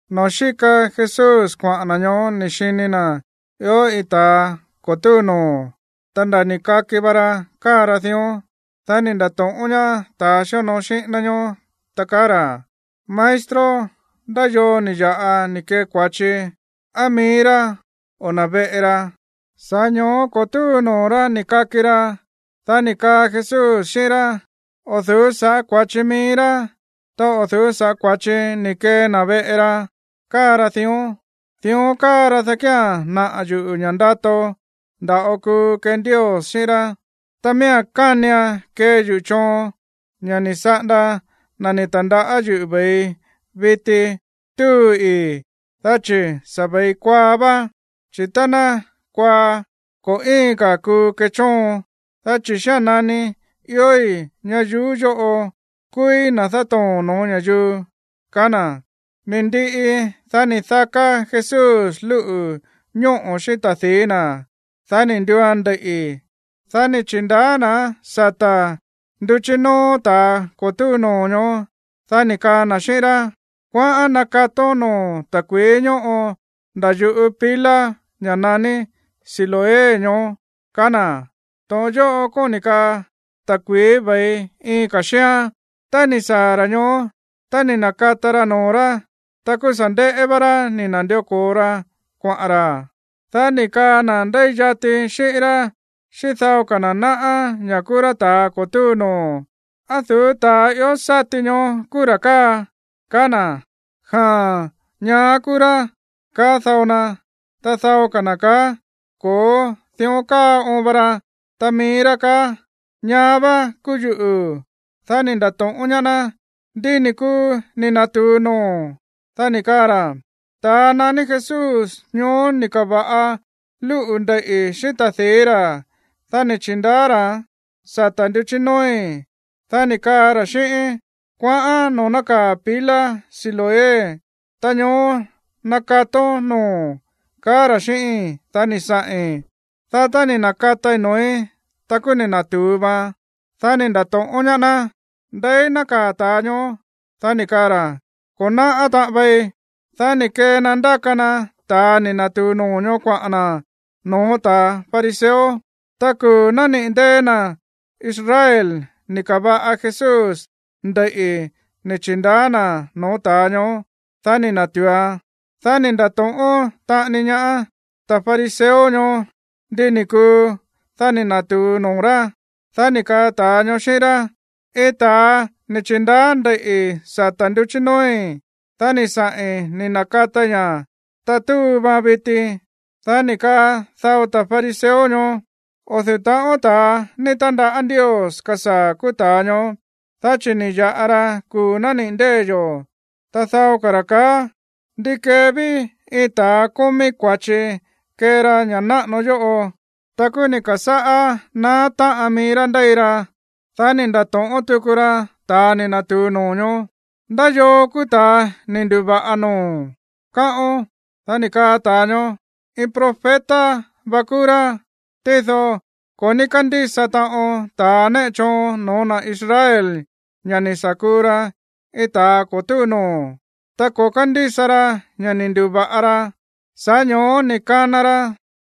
Noo̱ xíka Jesús kuaꞌa̱n na̱ ñoó ni̱ xini na̱ ió iin ta̱a ko̱ túu noo̱, ta nda̱ ni̱ kaki va ra káa ra dión. Dá ni̱ nda̱to̱ꞌón ñaá ta̱a xíonoo xíꞌín ná ñoó, ta kaá ra̱: ―Maestro, ¿ndá yoo ni̱ ya̱ꞌa ni̱ kee kua̱chi, á mií rá o na̱ veꞌe ra, sa̱ꞌá ño̱ó ko̱ túu noo̱ rá ni̱ kaki ra? Dá ni̱ kaa Jesús xíꞌín rá: ―O̱ du̱ú sa̱ꞌá kua̱chi mií rá, ta o̱ du̱ú sa̱ꞌá kua̱chi ni̱ kee na̱ veꞌe ra káa ra dión. Dión káa ra, dá kía̱n naꞌa̱ yuꞌu̱ ña̱ ndato nda̱ꞌo kuu kee Ndios xíꞌín rá. Ta miía̱n kánian kee yuꞌu̱ choon, ña̱ ni̱ saꞌanda na̱ ni̱ ta̱ndaꞌá yuꞌu̱ ve̱ii viti túu ii̱, dá chi̱ sa̱ ve̱i kuaa vá. Chi̱ tá ná kuaa, ko̱ íin ka̱ kuu kechóon. Dá chi̱ xía̱n nani iói̱ ñayuú yóꞌo, kúúí na̱ dátoo̱n no̱ó ña̱yuu ―kaá na̱. Ni̱ ndiꞌi, dá ni̱ daká Jesús lúꞌu̱ ñóꞌo̱ xíꞌín ta̱di̱í na̱. Dá ni̱ nduuan ndeiꞌi̱. Dá ni̱ chi̱ndaá na̱án sata̱ nduchí nóó ta̱a ko̱ túu noo̱ ñoó. Dá ni̱ kaa na̱ xíꞌín rá: ―Kuaꞌán nakatón noo̱o̱n ta̱kui̱í ñóꞌo nda̱ yuꞌú pila, ña̱ naní Siloé ñoó ―kaá na̱. (To̱ꞌon yóꞌo kóni̱ kaa ta̱kui̱í ve̱i iin ka̱ xíán.) Tá ni̱ saa̱ ra̱ ñoó, ta ni̱ na̱kata ra noo̱ rá, ta kúú sa̱ nde̱ꞌé vá rá ni̱ na̱ndió ko̱o ra kuaꞌa̱n ra̱. Dá ni̱ kaa na̱ ndéi yati xíꞌín rá xíꞌín dao ka̱ na̱ náꞌá ña̱ kúú rá ta̱a ko̱ túu noo̱: ―¿Á du̱ú ta̱a ió sáti ñoó kúú ra̱ káa? ―kaá na̱. ―Jaa̱n, ñaá kúú rá ―kaá dao na. Ta dao ka̱ na̱ kaá: ―Ko̱ó, dión káa oon va ra. Ta mií rá kaá: ―Ñaá vá kúú yuꞌu̱. Dá ni̱ nda̱to̱ꞌón ñaá ná: ―¿Ndi ni̱ kuu ni̱ na̱tu̱u noo̱o̱n? Dá ni̱ kaa ra̱: ―Ta̱a naní Jesús ñoó ni̱ ka̱va̱ꞌa lúꞌu̱ ndeiꞌi̱ xíꞌín ta̱di̱í ra̱, dá ni̱ chi̱ndaá ra̱án sata̱ nduchí nóói̱. Dá ni̱ kaa ra̱ xíꞌíín: “Kuaꞌán noo̱ nákaa̱ pila Siloé, ta ñoó nakatón noo̱o̱n”, kaá ra̱ xíꞌíi̱n. Dá ni̱ saꞌi̱n, dá tá ni̱ na̱katai noo̱í, ta kúú ni̱ na̱tu̱u vaan. Dá ni̱ nda̱to̱ꞌón ñaá ná: ―¿Ndeí nákaa̱ ta̱a ñoó? Dá ni̱ kaa ra̱: ―Ko̱ náꞌá taꞌon vei. Dá ni̱ kee na ndáka na ta̱a ni̱ na̱tu̱u noo̱ ñoó kuaꞌa̱n na̱ no̱ó ta̱ fariseo. Ta kuu̱ nániꞌi̱ ndée̱ na̱ Israel ni̱ ka̱va̱ꞌa Jesús ndeiꞌi̱ ni̱ chi̱ndaá na̱án noo̱ ta̱a ñoó, dá ni̱ na̱tu̱uan. Dá ni̱ nda̱to̱ꞌón taꞌani ñaá ta̱ fariseo ñoó ndi ni̱ kuu, dá ni̱ na̱tu̱u noo̱ rá. Dá ni̱ kaa ta̱a ñoó xíꞌín rá: ―Iin ta̱a ni̱ chi̱ndaá ndeiꞌi̱ sata̱ nduchí nóói̱, dá ni̱ saꞌi̱n ni̱ na̱katai ña̱, ta túu vaan viti. Dá ni̱ kaa dao ta̱ fariseo ñoó: ―O̱ du̱ú taꞌon ta̱a ni̱ ta̱ndaꞌá Ndios kasaa̱ kúú ta̱a ñoó, dá chi̱ ni̱ ya̱ꞌa ra kuu̱ nániꞌi̱ ndée̱ yo̱. Ta dao ka̱ ra̱ kaá: ―¿Ndi kee ví iin ta̱a kómí kua̱chi kee ra ña̱ náꞌano yóꞌo? Ta kúú ni̱ ka̱sáꞌá naá táꞌan mií rá ndéi ra. Dá ni̱ nda̱to̱ꞌón tuku ra ta̱a ni̱ na̱tu̱u noo̱ ñoó: ―¿Ndá yoo kúú ta̱a ni̱ ndu̱va̱ꞌa noo̱o̱n, káꞌón? Dá ni̱ kaa ta̱a ñoó: ―Iin profeta va kúú rá. Tído ko̱ ní kándísa taꞌon ta̱ néꞌe choon no̱ó na̱ Israel ña̱ ni̱ sa̱ kuu ra iin ta̱a ko̱ túu noo̱, ta ko̱ kándísa ra ña̱ ni̱ ndu̱va̱ꞌa ra. Sa̱ꞌá ño̱ó ni̱ kana ra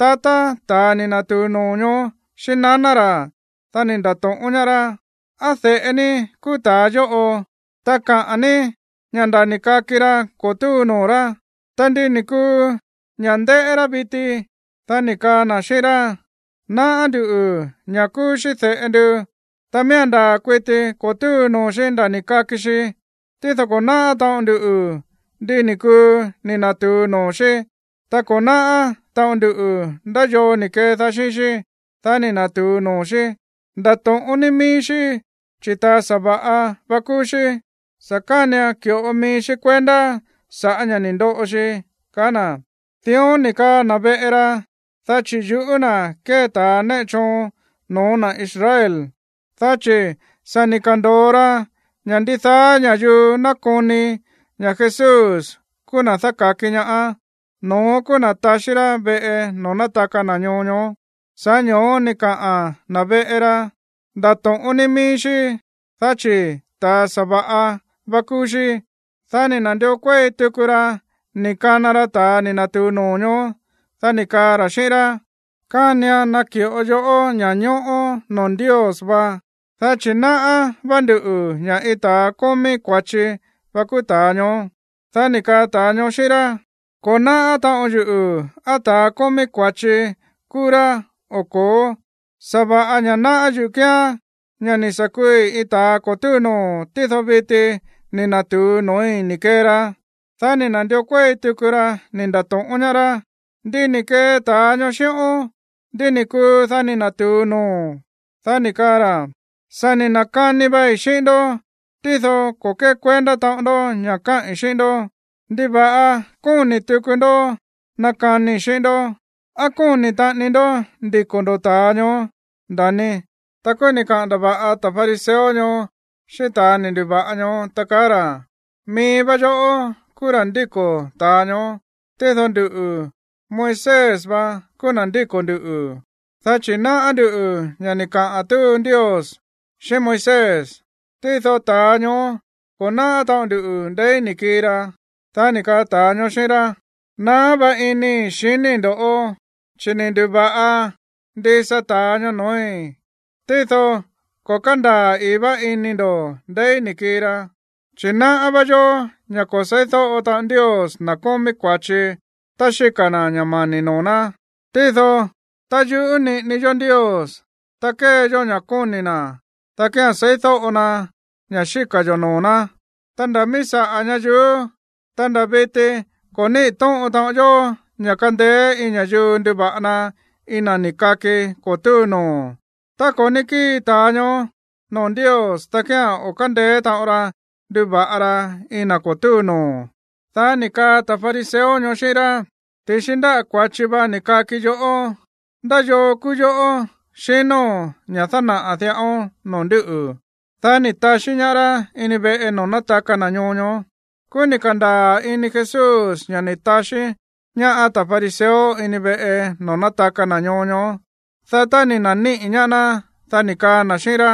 tatá ta̱a ni̱ na̱tu̱u noo̱ ñoó xíꞌín naná ra̱, dá ni̱ nda̱to̱ꞌón ñaá rá: ―¿Á de̱ꞌe ní kúú ta̱a yóꞌo? Ta káꞌa̱n ní ña̱ nda̱ ni̱ kaki ra ko̱ túu noo̱ rá. Ta, ¿ndi ni̱ kuu ña̱ ndéꞌé rá viti? Dá ni̱ kaa na̱ xíꞌín rá: ―Náꞌá nduꞌu̱ ña̱ kúú xí de̱ꞌe ndu, ta miía̱n ndaa̱ kuiti ko̱ túu noo̱ xí nda̱ ni̱ kaki xi. Tído ko̱ náꞌá taꞌon nduꞌu̱ ndi ni̱ kuu ni̱ na̱tu̱u noo̱ xí. Ta ko̱ náꞌá taꞌon ndu ndá yoo ni̱ kedaá xíꞌín xí, dá ni̱ na̱tu̱u noo̱ xí. Ndato̱ꞌón ní mií xí, chi̱ ta̱a sa̱va̱ꞌa vá kúú xí. Sa̱ kánian ki̱ꞌo mií xí kuendá sa̱ꞌá ña̱ ni̱ ndoꞌo xi ―kaá na̱. Dión ni̱ kaa na̱ veꞌe ra, dá chi̱ yuꞌú na̱ kée ta̱ néꞌe choon no̱ó na̱ Israel. Dá chi̱ sa̱ ni̱ ka̱ndo̱o ra ña̱ ndidaá ña̱yuu nakoni ña̱ Jesús kúú na̱ dáka̱ki ñaá, no̱ón kúú na̱ taxí rá veꞌe noo̱ nátaka na̱ ñoo ñoó. Sa̱ꞌá ño̱ó ni̱ kaꞌa̱n na̱ veꞌe ra: “Ndato̱ꞌón ní mií xí, dá chi̱ ta̱a sa̱va̱ꞌa vá kúú xí.” Dá ni̱ na̱ndió kuéi tuku ra ni̱ kana ra ta̱a ni̱ na̱tu̱u noo̱ ñoó. Dá ni̱ kaa ra̱ xíꞌín rá: ―Kánian naki̱ꞌo yoꞌó ña̱ñóꞌó noo̱ Ndios va, dá chi̱ náꞌá vá nduꞌu̱ ña̱ iin ta̱a kómí kua̱chi va kúú ta̱a ñoó. Dá ni̱ kaa ta̱a ñoó xíꞌín rá: ―Ko̱ náꞌá taꞌon yuꞌu̱ á ta̱a kómí kua̱chi kúú rá o ko̱ó. Sa̱va̱ꞌa ña̱ náꞌá yuꞌu̱ kíán ña̱ ni̱ sa̱ kuui iin ta̱a ko̱ túu noo̱, tído viti ni̱ na̱tu̱u noo̱í ni̱ kee ra. Dá ni̱ na̱ndió kuéi tuku ra ni̱ nda̱to̱ꞌón ñaá rá: ―¿Ndi ni̱ kee ta̱a ñoó xíꞌón? ¿Ndi ni̱ kuu, dá ni̱ na̱tu̱u noo̱o̱n? Dá ni̱ kaa ra̱: ―Sa̱ ni̱ na̱kani vai xíꞌín ndó, tído ko̱ kékuendá taꞌon ndó ña̱ káꞌi̱n xíꞌín ndó. ¿Ndiva̱ꞌa kóni̱ tuku ndó nakanii xíꞌín ndó? ¿Á kóni̱ taꞌani ndoꞌó ndiko̱ ndo̱ ta̱a ñoó, nda̱ni? Ta kúú ni̱ kaꞌa̱n ndava̱ꞌa ta̱ fariseo ñoó xíꞌín ta̱a ni̱ ndu̱va̱ꞌa ñoó, ta kaá ra̱: ―Mií vá yoꞌó kúú ra̱ ndíko̱ ta̱a ñoó. Tído nduꞌu̱, Moisés va kúú na̱ ndíko̱ nduꞌu̱. Dá chi̱ náꞌá ndú ña̱ ni̱ kaꞌa̱n túu Ndios xíꞌín Moisés. Tído ta̱a ñoó, ko̱ náꞌá taꞌon ndu ndeí ni̱ kii ra. Dá ni̱ kaa ta̱a ñoó xíꞌín rá: ―Naá vá inii̱ xiníi̱ ndoꞌó, chi̱ ni̱ ndu̱va̱ꞌa ndisa ta̱a ñoó noo̱í, tído ko̱ kándaa̱ ii̱ vá ini ndo̱ ndeí ni̱ kii ra. Chi̱ náꞌá vá yó ña̱ ko̱ seídóꞌo taꞌon Ndios na̱ kómí kua̱chi tá xíka̱ na̱ ña̱ mani̱ noo̱ ná. Tído tá yuꞌú niꞌini yó Ndios, ta kée yó ña̱ kóni̱ na̱, dá kía̱n seídóꞌo na ña̱ xíka̱ yo̱ noo̱ ná. Ta nda̱ mií saꞌa̱ ñayuú, ta nda̱ viti ko̱ níꞌi̱ to̱ꞌon taꞌon yó ña̱ kandeé iin ña̱yuu nduva̱ꞌa na iin na̱ ni̱ kaki ko̱ túu noo̱. Tá ko̱ ní kíi ta̱a ñoó noo̱ Ndios, dá kía̱n o̱ kándeé taꞌon ra nduva̱ꞌa ra iin na̱ ko̱ túu noo̱. Dá ni̱ kaa ta̱ fariseo ñoó xíꞌín rá: ―Ti̱xi ndáꞌa̱ kua̱chi va ni̱ kaki yoꞌó. ¿Ndá yoo kúú yoꞌó, xinóo̱n, ña̱ dánaꞌa̱ diꞌaón no̱ó nduꞌu̱? Dá ni̱ taxí ñaá rá ini veꞌe noo̱ nátaka na̱ ñoo ñoó. Kúú ni̱ ka̱ndaa̱ ini Jesús ña̱ ni̱ taxí ñaá ta̱ fariseo ini veꞌe noo̱ nátaka na̱ ñoo ñoó. Dá tá ni̱ na̱níꞌi̱ ñaá ná, dá ni̱ kaa na̱ xíꞌín rá: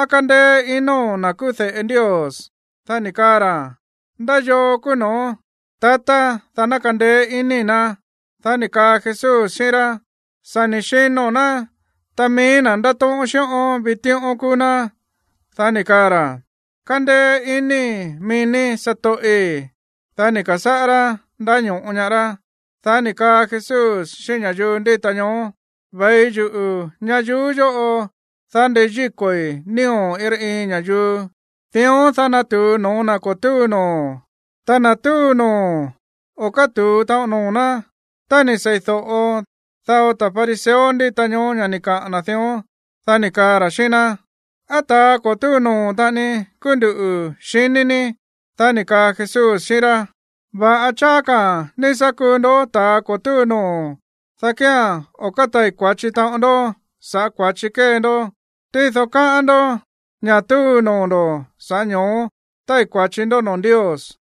―¿Á kándéé inóo̱n na̱ kúú de̱ꞌe Ndios? Dá ni̱ kaa ra̱: ―¿Ndá yoo kúú no̱ón, tatá, dá ná kandeé iníi̱ ná? Dá ni̱ kaa Jesús xíꞌín rá: ―Sa̱ ni̱ xino̱n ná. Ta mií na̱ ndátóꞌón xíꞌón vitíꞌón kúú ná. Dá ni̱ kaa ra̱: ―Kándéé iníi̱ mií ní, satoꞌi̱. Dá ni̱ ka̱sáꞌá rá ndáño̱ꞌo ñaá rá. Dá ni̱ kaa Jesús xíꞌín ña̱yuu ndíta ñoó: ―Ve̱i yuꞌu̱ ñayuú yóꞌo, dá ndeyíko̱i̱ nío̱ iin rá iin ña̱yuu. Dión, dá ná natu̱u noo̱ na̱ ko̱ túu noo̱. Ta na̱ túu noo̱, o̱ kátu̱u taꞌon noo̱ ná. Tá ni̱ seídóꞌo dao ta̱ fariseo ndíta ñoó ña̱ ni̱ kaꞌa̱n na̱ dión, dá ni̱ kaa ra̱ xíꞌín ná: ―¿Á ta̱a ko̱ túu noo̱ taꞌani kúú ndú, xiní ní? Dá ni̱ kaa Jesús xíꞌín rá: ―Va̱ꞌa cháá ka̱ ní sá kuu ndó ta̱ ko̱ túu noo̱, dá kía̱n o̱ kátai̱ kua̱chi taꞌon ndó saꞌa̱ kua̱chi kée ndó. Tído kaá ndo̱ ña̱ túu noo̱ ndo̱, sa̱ꞌá ño̱ó tái̱ kua̱chi ndó noo̱ Ndios.